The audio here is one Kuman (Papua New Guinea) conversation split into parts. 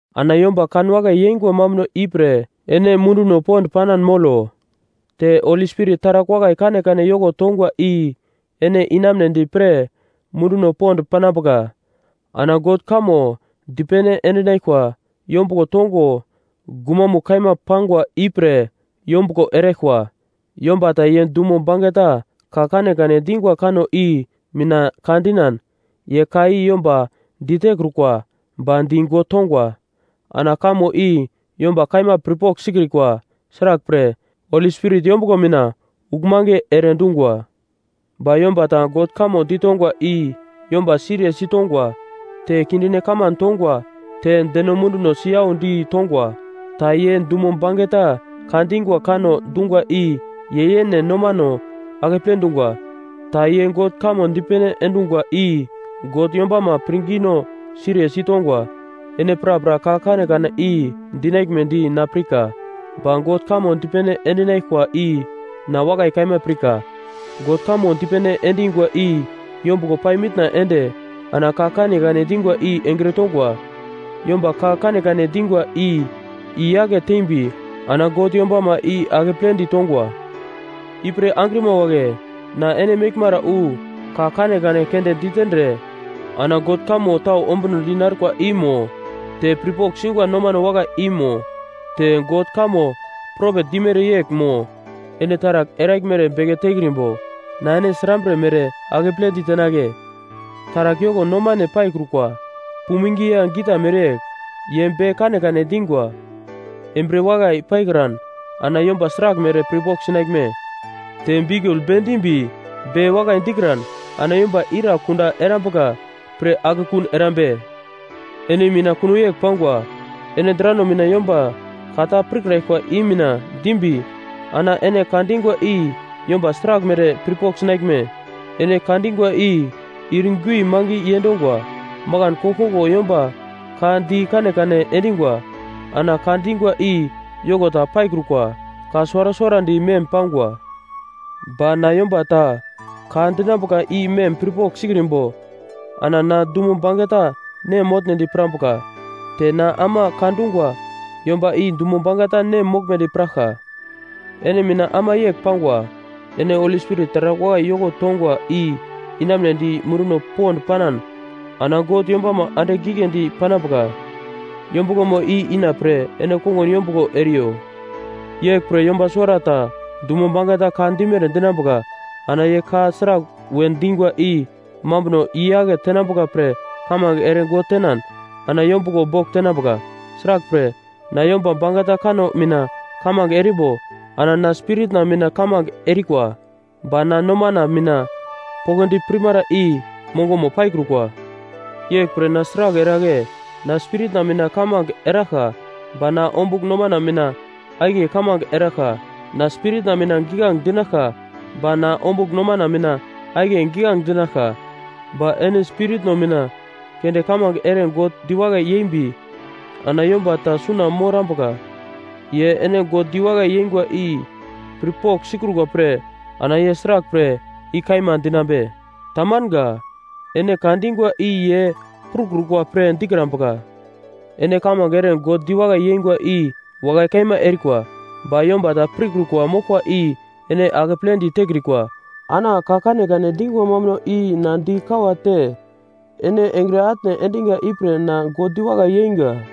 Ana yomba kanwakai yeingwa mambuno ipre ene munduno pond panan molo. Te Holi Spirit taragl wakai kanekane yoko tongwa i ene inamunedi pre munduno pond panambuka. Ana God kamo dipene endinaglkwa yombuglo tongo gumamugl kaima pangwa ipre yombuglo eraglkwa. Yomba ta ye dumo bangeta ka kanekane dingwa kanno i mina ka dinan, ye ka i yomba ditekrukwa ba di God tongwa. Ana kamo i yomba kaima pirpogl sikrikwa; sraglpre, Holi Spirit yombuglo mina uglmange ere dungwa. Ba yomba ta God kamo ditongwa i yomba siriye sitongwa, te kindine kaman tongwa, te deno munduno siyaudi tongwa. Ta ye dumo bangeta ka dingwa kanno dungwa i ye yene nomano akeple dungwa. Ta ye God kamo dipene endungwa i God yombama pirngino siriye sitongwa. Ene prapra ka kanekane i dinaglmedi na pirka. Ba God kamo dipene endinaglkwa i na wakai kaima pirka. God kamo dipene endingwa i yombuglo pai mitna ende ana ka kanekane dingwa i engre tongwa. Yomba ka kanekane dingwa i i-yake tembi ana God yombama i akepledi tongwa. Ipre angrima wagle, na ene meglmara wu ka kanekane keunde ditendre ana God kamo tau ombunodi narkwa i mo, te pirpogl singwa nomano wakai i mo, te God kamo propet dimere yegl mo, ene taragl eraglmere beke tekrimbo, na ene srambre mere akeple ditenagle? Taragl yoko nomane paikrukwa puming ya gita mereyegl, ye be kanekane dingwa, embriye wakai paikran ana yomba sraglmere pirpogl sinaglme? Te biukul bendimbi be wakai dikran ana yomba ira kunda erambuka pre akekun erambe? Ene mina kuno yegl pangwa. Ene drano mina yomba ka ta pirkraglkwa i mina dimbi ana ene ka dingwa i yomba sraglmere pirpogl sinaglme? Ene ka dingwa i ir gui mange yendongwa. Makan koglkoglo yomba ka di kanekane endingwa ana ka dingwa i yoko ta paikrukwa, ka suwara suwarandi mem pangwa. Ba na yomba ta ka dinambuka i mem pirpogl sikrimbo ana na dumo bangeta nem motnedi pirambuka. Te na ama ka dungwa yomba i dumo bangeta nem moglmedi piraglka. Ene mina ama yegl pangwa, ene Holi Spirit taragl wakai yoko tongwa i inamunedi munduno pond panan ana God yombama andigl giglendi panambuka yombuglomo i inapre ene kongun yombuglo eriyo. Yeglpre yomba suwarata dumo bangeta ka dimere dinambuka. Ana ye ka sragl we dingwa i mambunono i-yake tenambuka pre kamange ere God tenan ana yombuglo bogl tenambuka. Sraglpre, na yomba bangeta kanno mina kamange erimbo ana na spiritna mina kamange erikwa, ba na nomana mina poglodi pirmara i mongomo paikrukwa. Yeglpre na sragl eragle? Na spiritna mina kamange eraglka ba na ombugl nomana mina akiye kamange eraglka. Na spiritna mina giglange dinaglka ba na ombugl nomana mina akiye giglange dinaglka. Ba ene spiritno mina keunde kamange ere God diwakai yembi ana yomba ta suna morambuka, ye ene God diwakai yengwa i pirpogl sikrukwa pre, ana ye sraglpre “I kaima” dinambe? Tamanga. Ene ka dingwa i ye prukrukwa pre dikrambuka. Ene kamange ere God diwakai yengwa i wakai kaima erikwa, ba yomba ta pirkrukwa moglkwa i ene akepledi tekrikwa. Ana ka kanekane dingwa mambuno i na di kawate ene engre atne endiga ipre na God diwakai yeinga.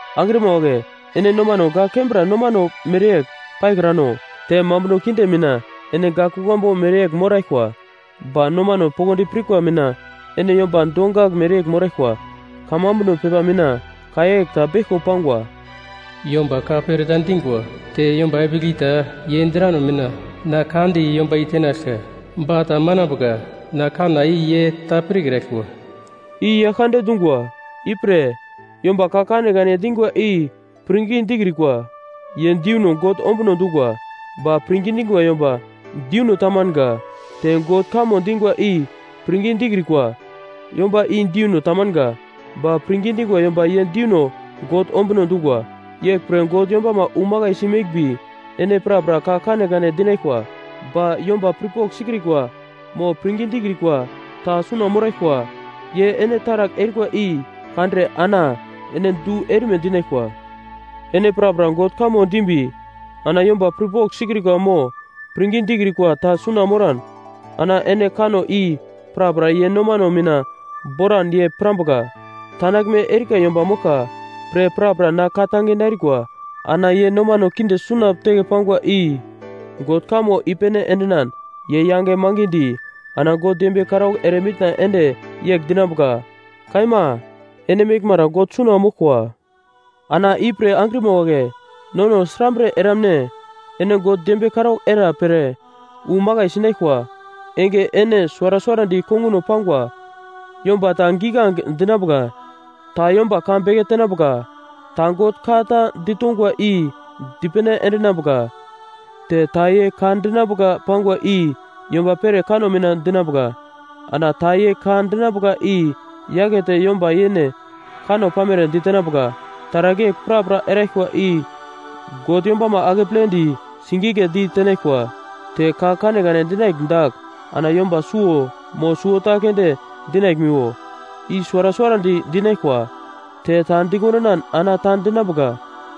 Angrima wagle, ene nomano gak kembra nomano mereyegl paikrano. Te mambuno kinde mina ene gak kuglambu mereyegl moraglkwa, ba nomano poglodi pirkwa mina ene yomba dongagl mereyegl moraglkwa. Kamambuno pepa mina ka yegl ta beglko pangwa: “Yomba ka pereta dingwa, te yomba epigl ta, ye drano mina, na ka di yomba i tenaglka. Ba ta manambuka, na kanna i ye ta pirkraglkwa,” i Yaglkande dungwa. Ipre, yomba ka kanekane dingwa i pirngi dikrikwa ye deuno God ombuno dungwa, ba pirngi dingwa yomba deuno tamanga. Te God kamo dingwa i pirngi dikrikwa yomba i deuno tamanga, ba pirngi dingwa yomba ye deuno God ombuno dungwa. Yeglpre God yombama wu makaisi meglmbi, ene prapra ka kanekane dinaglkwa. Ba yomba pirpogl sikrikwa mo pirngi dikrikwa ta suna moraglkwa, ye ene taragl erikwa i kandre ana ene du erime dinaglkwa. Ene prapra God kamo dimbi ana yomba pirpogl sikrikwa mo pirngi dikrikwa ta suna moran, ana ene kanno i prapra ye nomano mina boran ye pirambuka, tandaglme erika yomba moglka pre prapra na ka-tange narikwa. Ana ye nomano kinde suna teke pangwa i God kamo i-pene endinan, ye yange mangidi ana God dembiye karaugl ere mitna ende yegl dinambuka, “Kaima ene meglmara God suna moglkwa.” Ana ipre angrima wagle, nono srambre eramne? Ene God dembiye karaugl era pre wu makai sinaglkwa enge ene suwara suwarandi konguno pangwa; yomba ta giglange dinambuka, ta yomba ka beke tenambuka, ta God ka ta ditongwa i dipene endinambuka. Te ta ye ka dinambuka pangwa i yomba pere kanno mina dinambuka, ana ta ye ka dinambuka i-yakete yomba yene kanno pamere ditenambuka. Taragl yegl prapra eraglkwa i God yombama akepledi sigigledi tenaglkwa. Te ka kanekane dinaglm dagl ana yomba suwo mo suwota keunde dinaglmiwo, i suwara suwarandi dinaglkwa, te ta dikondinan ana ta dinambuka.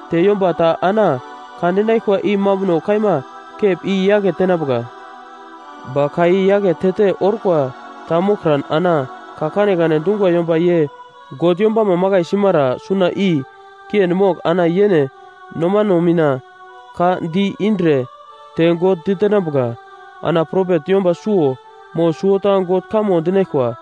Te yomba ta ana ka dinaglkwa i mambuno kaima kep i yake tenambuka. Ba ka i-yaketete orkwa ta moglkran ana ka kanekane dungwa yomba ye God yombama makai simara suna i kiendi mogl ana yene nomano mina ka di-indre te God ditenambuka. Ana propet yomba suwo mo suwota God kamo dinaglkwa,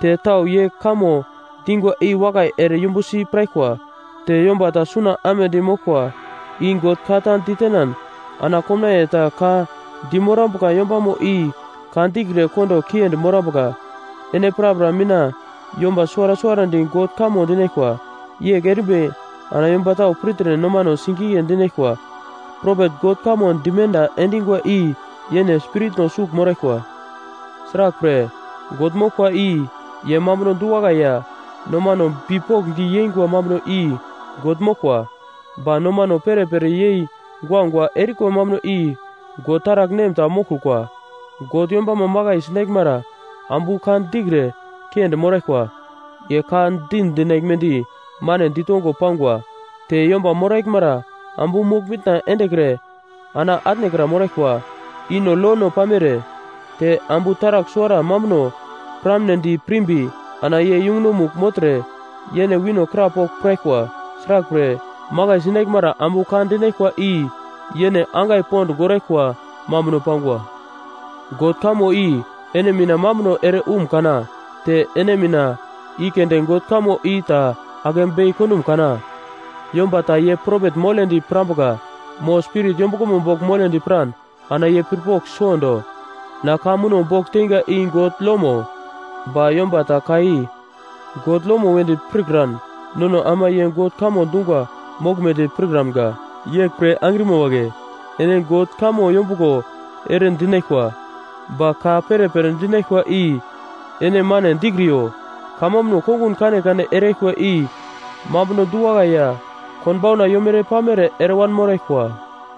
te tau ye kamo dingwa i wakai ere yumbusi piraglkwa. Te yomba ta suna amedi moglkwa i God ka ta ditenan ana komnaiye ta ka dimorambuka yombamo i ka dikre kondo kiendi morambuka. Ene prapra mina yomba suwara suwarandi God kamo dinaglkwa, yegl erimbi ana yomba tau pirtre nomano sigigle dinaglkwa. Propet God kamo dimenda endingwa i yene spiritno sugl moraglkwa. Sraglpre, God moglkwa i ye mambuno du-wakai ya nomano bipokndi yeingwa mambuno i God moglkwa, ba nomano perepere yei guagua erikwa mambuno i God taragl nem ta moglkrukwa. God yombama makai sinaglmara ambu ka dikre kiendi moraglkwa. Ye ka di dinaglmedi mane ditongo pangwa. Te yomba moraglmara ambu mogl-mitna endekre ana atnekra moraglkwa. I no lono pamere. Te ambu taragl suwara mambuno piramnedi pirmbi ana ye yungunomugl mogltre yene wino krapogl piraglkwa. Sraglpre, makai sinaglmara ambu ka dinaglkwa i yene angai pond goraglkwa mambuno pangwa. God kamo i ene mina mambuno ere umkana? Te ene mina i keunde God kamo i ta ake bei kondum kana? Yomba ta ye propet moledi pirambuka mo Spirit yombuglomo bogl moledi piran ana ye pirpogl suwondo. Na ka muno bogl teinga i God lomo. Ba yomba ta ka i God lomo wedi pirkan, nono ama ye God kamo dungwa moglmedi pirkramga. Yeglpre angrima wagle, ene God kamo yombuglo ere dinaglkwa. Ba ka perepere dinaglkwa i ene mane dikriyo. Kamambuno kongun kanekane eraglkwa i mambuno du-wakai ya konbauna yomere-pamere eremoraglkwa.